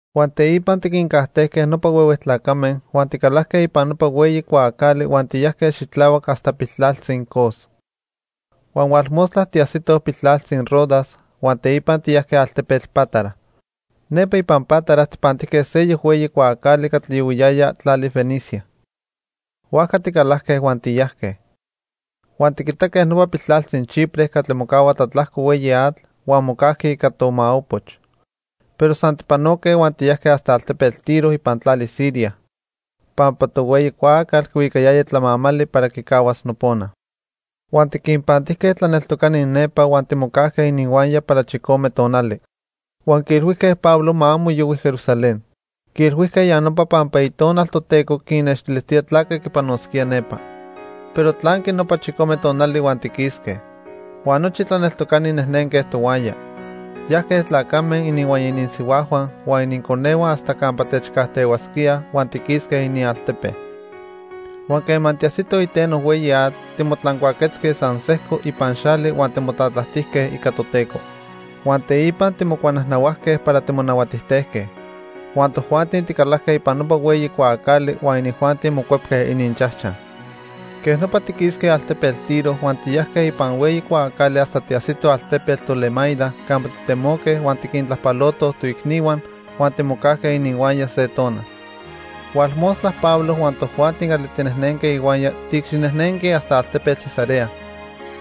Huan teipa tiquincajtejque nopa huehue tlacame huan ticalajque ipan nopa hueyi cuaacali huan tiyajque xitlahuac hasta piltlaltzi Cos. Huan hualmostla tiajsitoj piltlaltzi Rodas huan teipa tiyajque altepetl Pátara. Nepa ipan Pátara tijpantijque seyoc hueyi cuaacali catli yohuiyaya tlali Fenicia. Huajca ticalajque huan tiyajque. Huan tiquitaque nopa piltlaltzi Chipre catli mocahua tlatlajco hueyi atl huan mocajqui ica tomaopoch. Pero san tijpanoque huan tiyajque hasta altepetl Tiro ipan tlali Siria pampa tohueyi cuaacal quihuicayaya tlamamali para quicahuas nopona. Huan tiquinpantijque tlaneltocani nepa huan timocajque ininhuaya para chicome tonali. Huan quiilhuijque Pablo ma amo yohui Jerusalén. Quiilhuijque ya nopa pampa Itonal Toteco quinnextilijtoya tlaque quipanosquía nepa. Pero tlanqui nopa chicome tonali huan tiquisque. Huan nochi tlaneltocani nejnenque tohuaya. Yajque tlacame, ininhuaya ininsihuajhua, huan ininconehua hasta campa techcajtehuasquíaj huan tiquisque inialtepe. Huan quema tiajsitoj iteno hueyi atl, timotlancuaquetzque san sejco ipan xali huan timotlatlajtijque ica Toteco. Huan teipa timocuanajnahuajque para timonahuatijtejque. Huan tojuanti ticalajque ipan nopa hueyi cuaacali huan inijuanti mocuepque ininchajchaj. Quej nopa tiquisque altepetl Tiro huan tiyajque ipan hueyi cuaacali hasta tiajsitoj altepetl Tolemaida campa titemoque huan tiquintlajpalotoj toicnihua huan timocajque ininhuaya se tonal. Hualmostla Pablo huan tojuanti catli tinejnenque ihuaya tiicxinejnenque hasta altepetl Cesarea.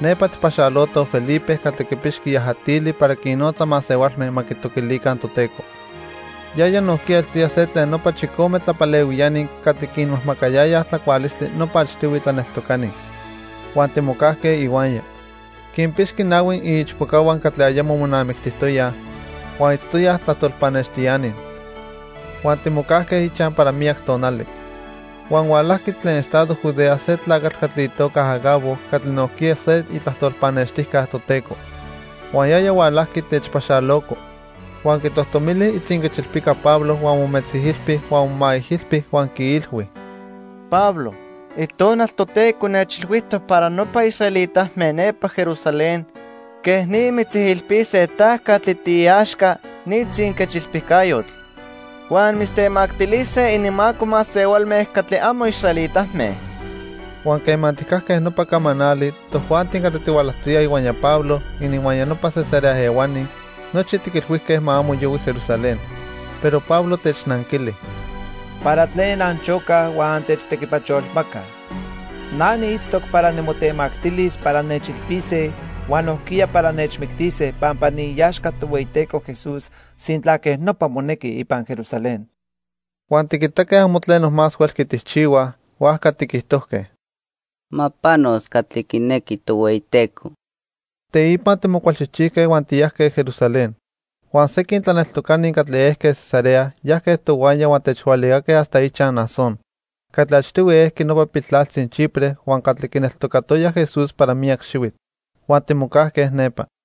Nepa tijpaxalotoj Felipe catli quipixqui yajatili para quinnotza masehualme ma quitoquilica Toteco. Yaya nojquiya eltoya se tlen nopa chicome tlapalehuiani catli quinmajmacayayaj tlacualistli nopa achtihui tlaneltocani. Huan timocajque ihuaya. Quinpixqui nahui iichpocahua catli ayamo monamictijtoyaj huan itztoyaj tlajtol pannextiani. Huan timocajque ichaj para miyac tonali. Huan hualajqui tlen estado Judea se tlacatl catli itoca Agabo catli nojquiya se itlajtol pannextijca Toteco. Huan yaya hualajqui techpaxaloco, huan quitojtomili itzinquechilpica Pablo huan mometzijilpi huan momaijilpi huan quiilhui: —Pablo, Itonal Toteco nechilhuijtoc para nopa israelitame nepa Jerusalén quej ni mitzijilpise ta catli tiiaxca ni tzinquechilpicayotl. Huan mitztemactilise ininmaco masehualme catli amo israelitame. Huan quema tijcajque nopa camanali, tojuanti catli tihualajtoyaj ihuaya Pablo, ininhuaya nopa Cesarea ehuani, nochi tiquilhuijque ma amo yohui Jerusalén. Pero Pablo technanquili: —¿Para tlen anchocaj huan antechtequipacholmacaj? Na niitztoc para nimotemactilis para nechilpise huan nojquiya para nechmictise pampa niiaxca Tohueyiteco Jesús sintla quej nopa monequi ipan Jerusalén. Huan tiquitaque amo tleno más huelqui tijchihuaj, huajca tiquijtojque: —Ma panos catli quinequi Tohueyiteco. Teipa timocualchijchijque huan tiyajque Jerusalén. Huan sequin tlaneltocani catli ejque Cesarea yajque tohuaya huan techhualicaque hasta ichaj Mnasón catli achtihui ejqui nopa piltlaltzi Chipre huan catli quineltocatoya Jesús para miyac xihuitl. Huan timocajque nepa.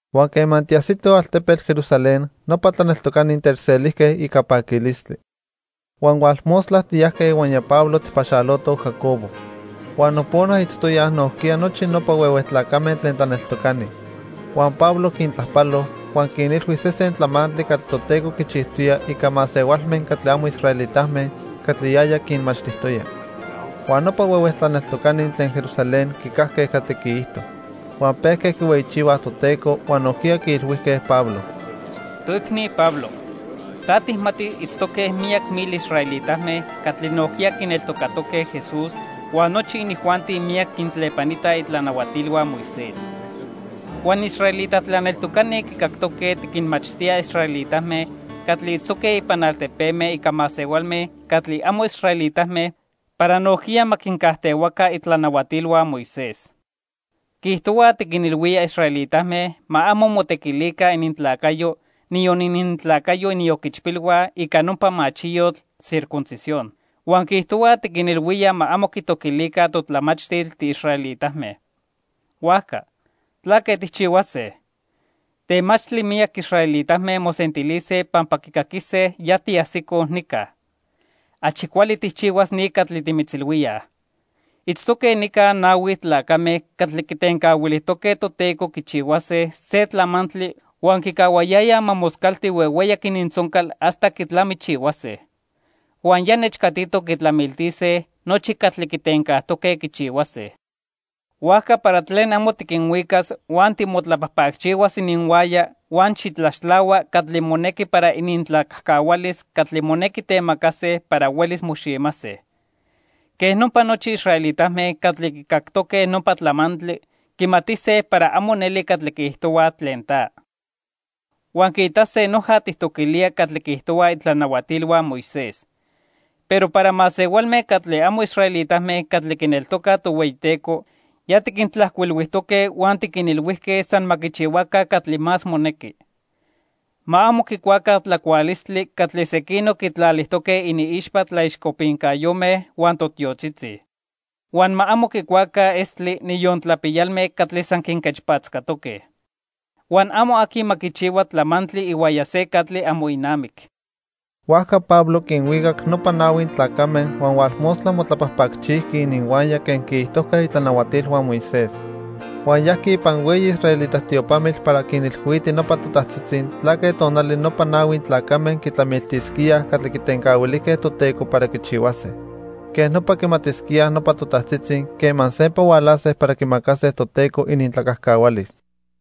Huan quema tiajsitoj altepetl Jerusalén, nopa tlaneltocani techselijque ica paquilistli. Huan hualmostla tiyajque ihuaya Pablo tijpaxalotoj Jacobo, huan nopona itztoyaj nojquiya nochi nopa huehue tlacame tlen tlaneltocani. Huan Pablo quintlajpalo, huan quinilhui sesen tlamantli catli Toteco quichijtoya ica masehualme catli amo israelitame catli yaya quinmachtijtoya. Huan nopa huehue tlaneltocani tlen Jerusalén quicajque catli quiijto. Huan pejque quihueyichihuaj Toteco, huan nojquiya quiilhuijque Pablo: —Toicni Pablo, ta tijmati itztoque miyac mil israelitame catli nojquiya quineltocatoque Jesús, huan nochi inijuanti miyac quintlepanitaj itlanahuatilhua Moisés. Huan israelita tlaneltocani quicactoque tiquinmachtía israelitame catli itztoque ipan altepeme ica masehualme catli amo israelitame para nojquiya ma quincajtehuaca itlanahuatilhua Moisés. Quiijtohuaj tiquinilhuía israelitame ma amo motequilica inintlacayo, niyon inintlacayo inioquichpilhua, ica nopa machiyotl circuncisión. Huan quiijtohuaj tiquinilhuía ma amo quitoquilica totlamachtil tiisraelitame. Huajca ¿tlaque tijchihuase? Temachtli miyac israelitame mosentilise pampa quicaquise ya tiajsicoj nica. Achi cuali tijchihuas ni catli timitzilhuíaj. Itztoque nica nahui tlacame catli quitencahuilijtoque Toteco quichihuase se tlamantli huan quicahuayayaj ma moscalti huehueyac inintzoncal hasta quitlamichihuase. Huan ya nechcatitoc quitlamiltise nochi catli quitencajtoque quichihuase. Huajca para tlen amo tiquinhuicas huan timotlapajpacchihuas ininhuaya huan xitlaxtlahua catli monequi para inintlacajcahualis catli monequi temacase para huelis moximase. Quej nopa nochi israelitame catli quicactoque nopa tlamantli, quimatise para amo neli catli quiijtohuaj tlen ta. Huan quiitase noja tijtoquilía catli quiijtohuaj itlanahuatilhua Moisés. Pero para masehualme catli amo israelitame catli quineltocaj Tohueyiteco, ya tiquintlajcuilhuijtoque huan tiquinilhuijque san ma quichihuaca catli más monequi. Ma amo quicuaca tlacualistli catli sequinoc quitlalijtoque iniixpa tlaixcopincayome huan totiotzitzi. Huan ma amo quicuaca estli, niyon tlapiyalme catli san quinquechpatzcatoque. Huan amo aqui ma quichihua tlamantli ihuaya se catli amo inamic. Huajca Pablo quinhuicac nopa nahui tlacame huan hualmostla motlapajpacchijqui ininhuaya quen quiijtojque itlanahuatilhua Moisés. Huan yajqui ipan hueyi israelita tiopamitl para quinilhuiti nopa totajtzitzi tlaque tonali nopa nahui tlacame quitlamiltisquíaj catli quitencahuilijque Toteco para quichihuase. Quej nopa quimatisquíaj nopa totajtzitzi quema sempa hualase para quimacase Toteco inintlacajcahualis.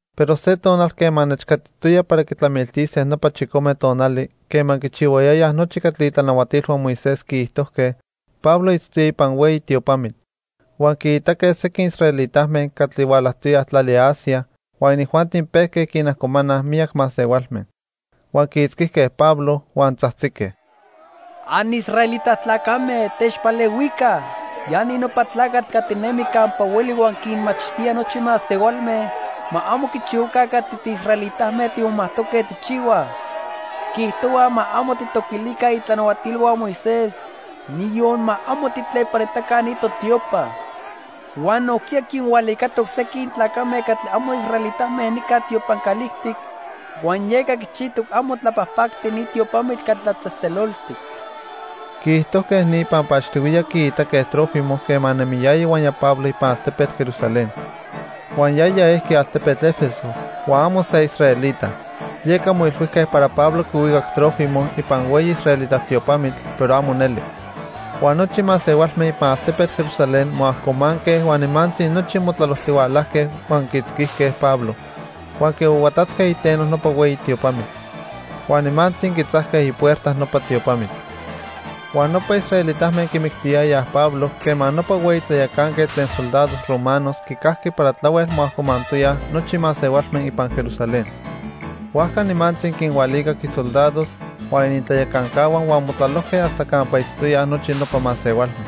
Pero se tonal quema nechcatitoya para quitlamiltise nopa chicome tonali quema quichihuayayaj nochi catli itlanahuatilhua Moisés quiijtojque, Pablo itztoya ipan hueyi tiopamitl. Huan quiitaque sequin israelitame catli hualajtoyaj tlali Asia huan inijuanti pejque quinajcomanaj miyac masehualme. Huan quiitzquijque Pablo, huan tzajtzique: "Anisraelita tlacame, techpalehuica. Ya ni nopa tlacatl catli nemi campa hueli huan quinmachtía nochi masehualme ma amo quichihuaca catli tiisraelitame timomajtoque tijchihuaj. Quiijtohua ma amo tijtoquilica itlanahuatilhua Moisés, niyon ma amo tijtlepanitaca ni totiopa. Huan nojquiya quinhualicatoc sequin tlacame catli amo israelitame nica tiopan calijtic huan yeca quichijtoc amo tlapajpactli ni tiopamitl catli tlatzejtzeloltic." Quiijtojque ni pampa achtihuiya quiitaque Trófimo quema nemiyaya ihuaya Pablo ipan altepetl Jerusalén. Huan yaya ejqui altepetl 'Efeso huan amo se israelita. Yeca moilhuijque para Pablo quihuicac Trófimo ipan hueyi israelita tiopamitl, pero amo neli. Huan nochi masehualme ipan altepetl Jerusalén moajcomanque huan nimantzi nochi motlalojtihualajque huan quiitzquijque Pablo huan quihuahuatatzque iteno nopa hueyi tiopamitl. Huan nimantzi quitzajque ipuerta nopa tiopamitl. Huan nopa israelitame quimictiyayaj Pablo quema nopa hueyi tlayacanquetl tlen soldados romanos quicajqui para tlahuel moajcomantoyaj nochi masehualme ipan Jerusalén. Huajca nimantzi quinhualicac isoldados huan inintlayacancahua huan motlalojque hasta campa itztoyaj nochi nopa masehualme.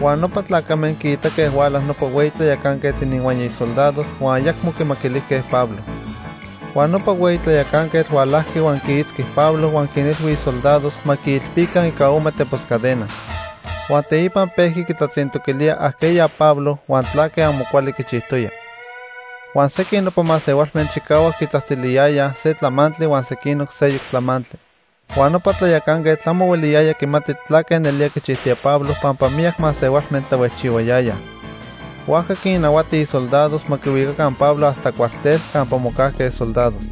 Huan nopa tlacame quiitaque huala nopa hueyi tlayacanquetl ininhuaya isoldados huan ayacmo quimaquilijque Pablo. Huan nopa hueyi tlayacanquetl hualajqui huan quiitzqui Pablo huan quinilhui isoldados ma quiilpica ica ome tepos cadena. Huan teipa pejqui quitlatzintoquilía ajqueya Pablo huan tlaque amo cuali quichijtoya. Huan sequin nopa masehualme chicahuac quitzajtziliyayaj se tlamantli huan sequinoc seyoc tlamantli. Huan nopa tlayacanquetl amo hueliyaya quimati tlaque nelía quichijtoya Pablo pampa miyac masehualme tlahuejchihuayayaj. Huajca quinnahuati isoldados ma quihuicaca Pablo hasta cuartel campa mocajque soldados.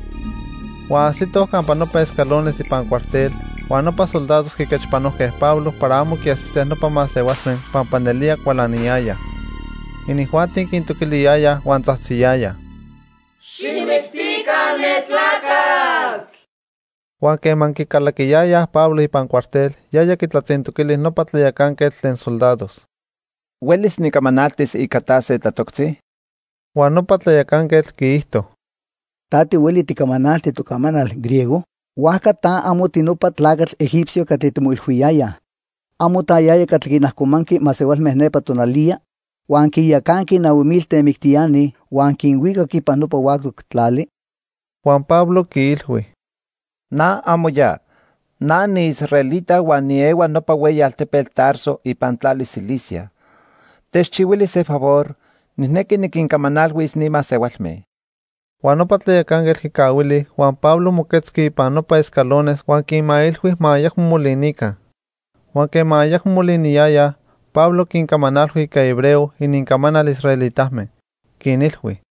Huan ajsitoj campa nopa escalones ipan cuartel, huan nopa soldados quiquechpanojque Pablo para amo quiajsise nopa masehualme pampa nelía cualaniyayaj. Inijuanti quintoquiliyayaj huan tzajtziyayaj: "¡Xijmictica ne tlacatl!" Huan quema quicalaquiyayaj Pablo ipan cuartel, yaya quitlatzintoquili nopa tlayacanquetl tlen soldados: —¿Huelis nicamanaltis ica ta se tlatoctzi? Huan nopa tlayacanquetl quiijto: —¿Ta tihueli ticamanalti tocamanal, griego? Huajca ta amo tinopa tlacatl egipcio catli timoilhuiyayaj. ¿Amo ta yaya catli quinajcomanqui masehualme nepa tonaliya, huan quinyacanqui nahui mil temictiani huan quinhuicac ipan nopa huactoc tlali? Huan Pablo quiilhui: —Na amo ya. Na niisraelita huan niehua nopa hueyi altepetl Tarso ipan tlali Cilicia. Techchihuili se favor, nijnequi niquincamanalhuis ni masehualme. Huan nopa tlayacanquetl quicahuili, huan Pablo moquetzqui ipan nopa escalones huan quinmailhui ma ayacmo molinica. Huan quema ayacmo moliniyayaj, Pablo quincamanalhui ica hebreo, inincamanal israelitame. Quinilhui: